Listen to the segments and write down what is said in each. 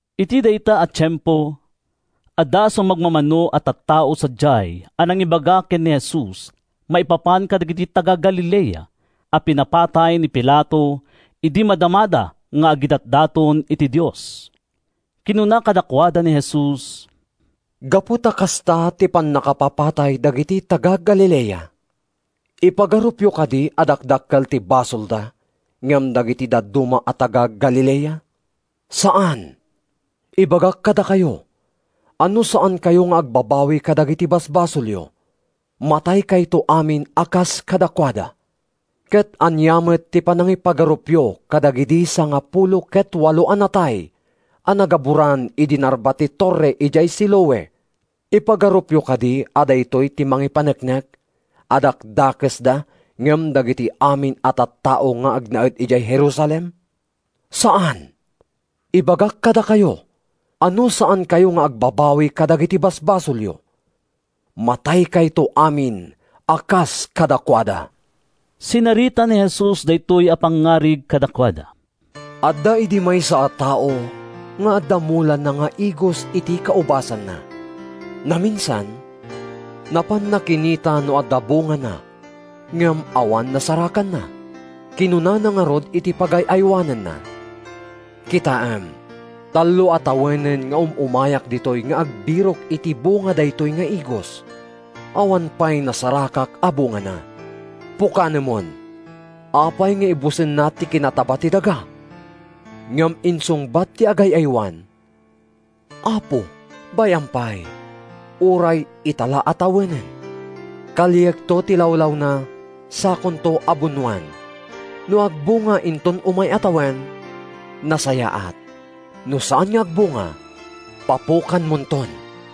Iti dayta a tiempo, adda sumagmamano a tattao sadiay a nangibaga ken ni Jesus maipapan kadagiti taga-Galilea a pinapatay ni Pilato idi madamada nga agidatdaton iti Dios. Kinuna kadakuada ni Jesus, “Gapu ta kasta ti pannakapapatay dagiti taga-Galilea, ipagarupyo kadi a dakdakkel ti basolda ngem dagiti dadduma a taga-Galilea? Saan! Ibagak kadakayo a no saankayo nga agbabawi kadagiti basbasolyo, mataykayto amin a kas kadakuada. “Ket ania met ti panangipagarupyo kadagidi sangapulo ket walo a natay a nagaburan idi narba ti torre idiay Siloe? Ipagarupyo kadi a daytoy ti mangipaneknek a dakdakesda ngem dagiti amin a tattao nga agnaed idiay Jerusalem? Saan! Ibagak kadakayo a no saankayo nga agbabawi kadagiti basbasolyo, mataykayto amin a kas kadakuada.” Sinarita ni Jesus daytoy a pangngarig kadakuada: “Adda idi maysa a tao nga adda mulana nga igos iti kaubasanna. Naminsan, napanna kinita no adda bungana ngem awan nasarakanna. Kinunana ngarud iti pagay-aywanenna, ‘Kitaem, tallo a tawenen nga um-umayak ditoy nga agbirok iti bunga daytoy nga igos. Awan pay nasarakak a bungana. Pukanemon! Apay nga ibusenna ti kinataba ti daga?’ Ngem insungbat ti agay-aywan, ‘Apo, bay-am pay, uray ita la a tawenen. Kaliakto ti lawlawna sakonto abunoan. No agbunga inton umay a tawen, nasayaat. No saan nga agbunga, papukanmonton.’”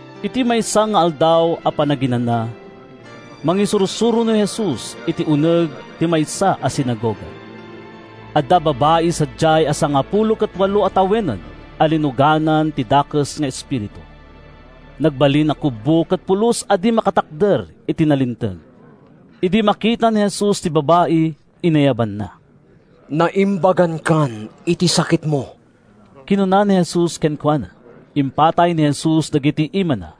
Iti maysa nga Aldaw a Panaginana, mangisursuro ni Jesus iti uneg ti maysa a sinagoga. Adda babai sadiay a sangapulo ket walo a tawenen a linuganan ti dakes nga espiritu. Nagbalin a kubbo ket pulos a di makatakder iti nalinteg. Idi makita ni Jesus ti babai, inayabanna. “Naimbagankan iti sakitmo!” kinuna ni Jesus kenkuana. Impatay ni Jesus dagiti imana.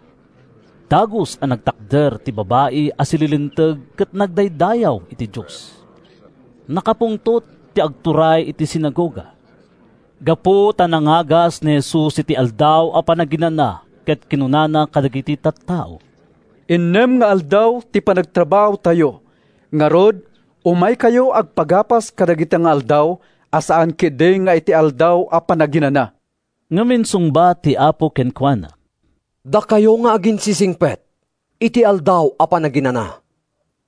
Dagus a nagtakder ti babai a sililinteg ket nagdaydayaw iti Dios. Nakapungtot ti agturay iti sinagoga, gapu ta nangagas ni Jesus iti Aldaw a Panaginana ket kinunana kadagiti tattao, “Innem nga aldaw ti panagtrabahotayo. Ngarud, umaykayo agpaagas kadagita nga aldaw, a saan ketdi nga iti Aldaw a Panaginana!” Ngem insungbat ti Apo kenkuana, “Dakayo nga aginsisingpet! Iti Aldaw a Panaginana,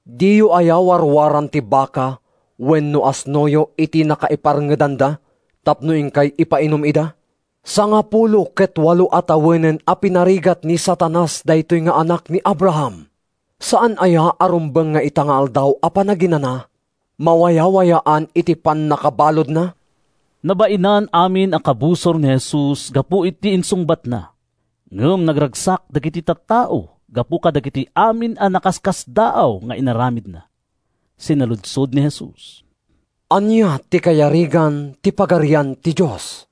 diyo aya warwaran ti baka wenno asnoyo iti nakaiparngedanda tapno inkay ipainum ida? Sangapulo ket walo a tawenen a pinarigat ni Satanas daytoy nga anak ni Abraham. Saan aya a rumbeng nga ita nga Aldaw a Panaginana, mawayawayaan iti pannakabaludna?” Nabainan amin a kabusor ni Jesus gapu iti insungbatna. Ngem nagragsak dagiti tattao gapu kadagiti amin a nakaskasdaaw nga inaramidna. Sinaludsod ni Jesus, “Ania ti kayarigan ti Pagarian ti Dios?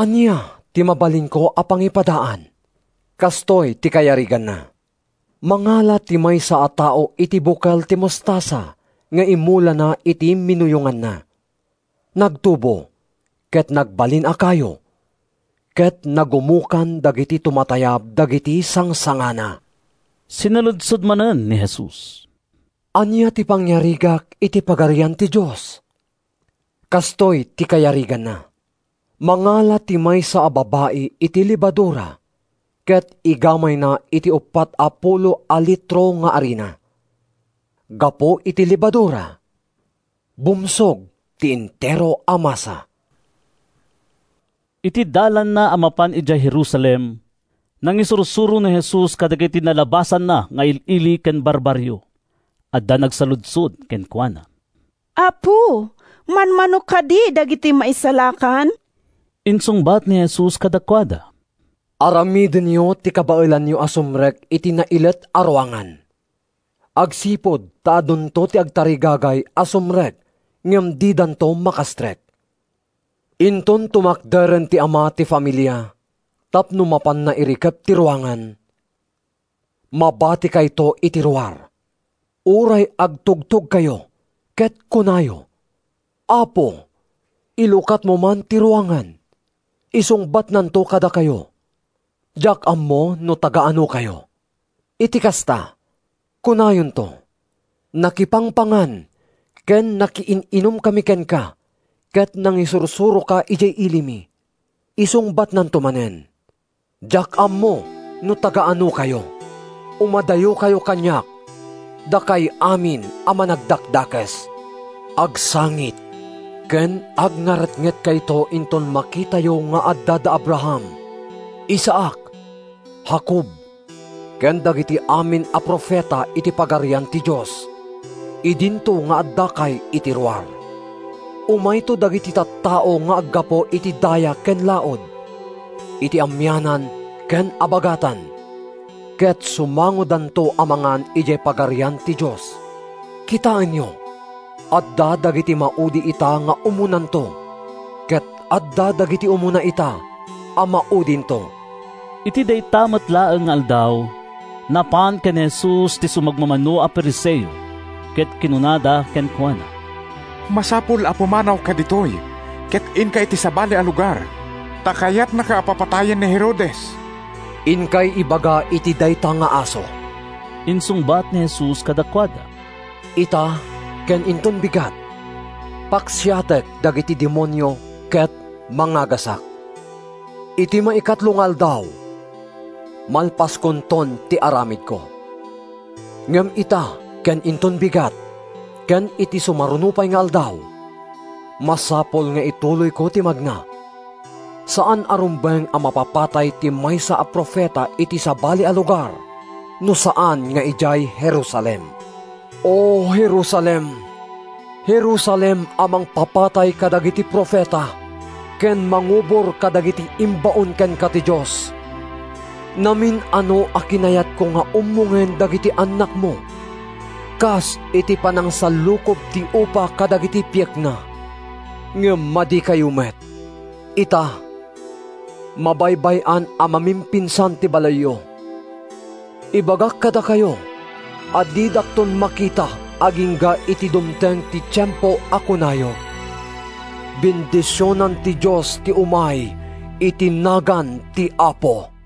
Ania ti mabalinko a pangipadaan? Kastoy ti kayariganna: mangala ti maysa a tao iti bukel ti mostasa nga imulana iti minuyonganna. Nagtubo ket nagbalin a kayo, ket nagumokan dagiti tumatayab dagiti sangsangana.” Sinaludsod manen ni Jesus, “Ania ti pangyarigak iti Pagarian ti Dios? Kastoy ti kayariganna: mangala ti maysa a babai iti lebadura ket igamayna iti uppat a pulo a litro nga arina. Gapu iti lebadura, bumsog ti entero a masa.” Iti dalanna a mapan idiay Jerusalem, nangisursuro ni Jesus kadagiti nalabasanna nga il-ili ken barbarrio. Adda nagsaludsod kenkuana, “Apo, manmano kadi dagiti maisalakan?” Insungbat ni Jesus kadakuada, “Aramidenyo ti kabaelanyo a sumrek iti nailet a ruangan, agsipud ta adunto ti agtarigagay a sumrek ngem didanto makastrek. “Inton tumakderen ti ama ti familia tapno mapanna irikep ti ruangan, mabatikayto iti ruar. Uray agtugtogkayo ket kunayo, ‘Apo, ilukatmo man ti ruangan,’ isungbatnanto kadakayo, ‘Diak ammo no taga-anokayo.’ Iti kasta, kunayonto, ‘Nakipangpangan ken nakiin-inumkami kenka ket nangisursuroka idiay ilimi.’ Isungbatnanto manen, ‘Diak ammo no taga-anokayo. Umadayokayo kaniak, dakay amin a managdakdakes!’ Agsangit ken agngaretngetkayto inton makitayo nga adda da Abraham, Isaac, Jacob ken dagiti amin a profeta iti Pagarian ti Dios, idinto nga addakay iti ruar! Umayto dagiti tattao nga aggapu iti daya ken laud, iti amianan ken abagatan, ket sumangodanto a mangan idiay Pagarian ti Dios. “Kitaenyo, adda dagiti maudi ita nga umunanto, ket adda dagiti umuna ita a maudinto.” Iti dayta met laeng nga aldaw, napan ken ni Jesus ti sumagmamano a Fariseo ket kinunada kenkuana, “Masapul a pumanawka ditoy ket inka iti sabali a lugar, ta kayatnaka a papatayen ni Herodes.” “Inkay ibaga iti dayta nga aso,” insungbat ni Jesus kadakuada. “‘Ita ken inton bigat, paksiatek dagiti demonio ket mangagasak. Iti maikatlo nga aldaw, malpaskonton ti aramidko.’ Ngem ita ken inton bigat, ken iti sumaruno pay nga aldaw, masapul nga ituloyko ti magna. Saan a rumbeng a mapapatay ti maysa a profeta iti sabali a lugar no saan nga idiay Jerusalem. “O Jerusalem, Jerusalem a mangpapatay kadagiti profeta ken mangubor kadagiti imbaon kenka ti Dios! Namin-ano a kinayatko nga ummongen dagiti annakmo, kas iti panangsallukob ti upa kadagiti piekna, ngem madikayo met! Ita, mabaybay-an a mamimpinsan ti balayyo. Ibagak kadakayo a didakton makita agingga iti dumteng ti tiempo a kunayo: ‘Bendisionan ti Dios ti umay iti nagan ti Apo!’”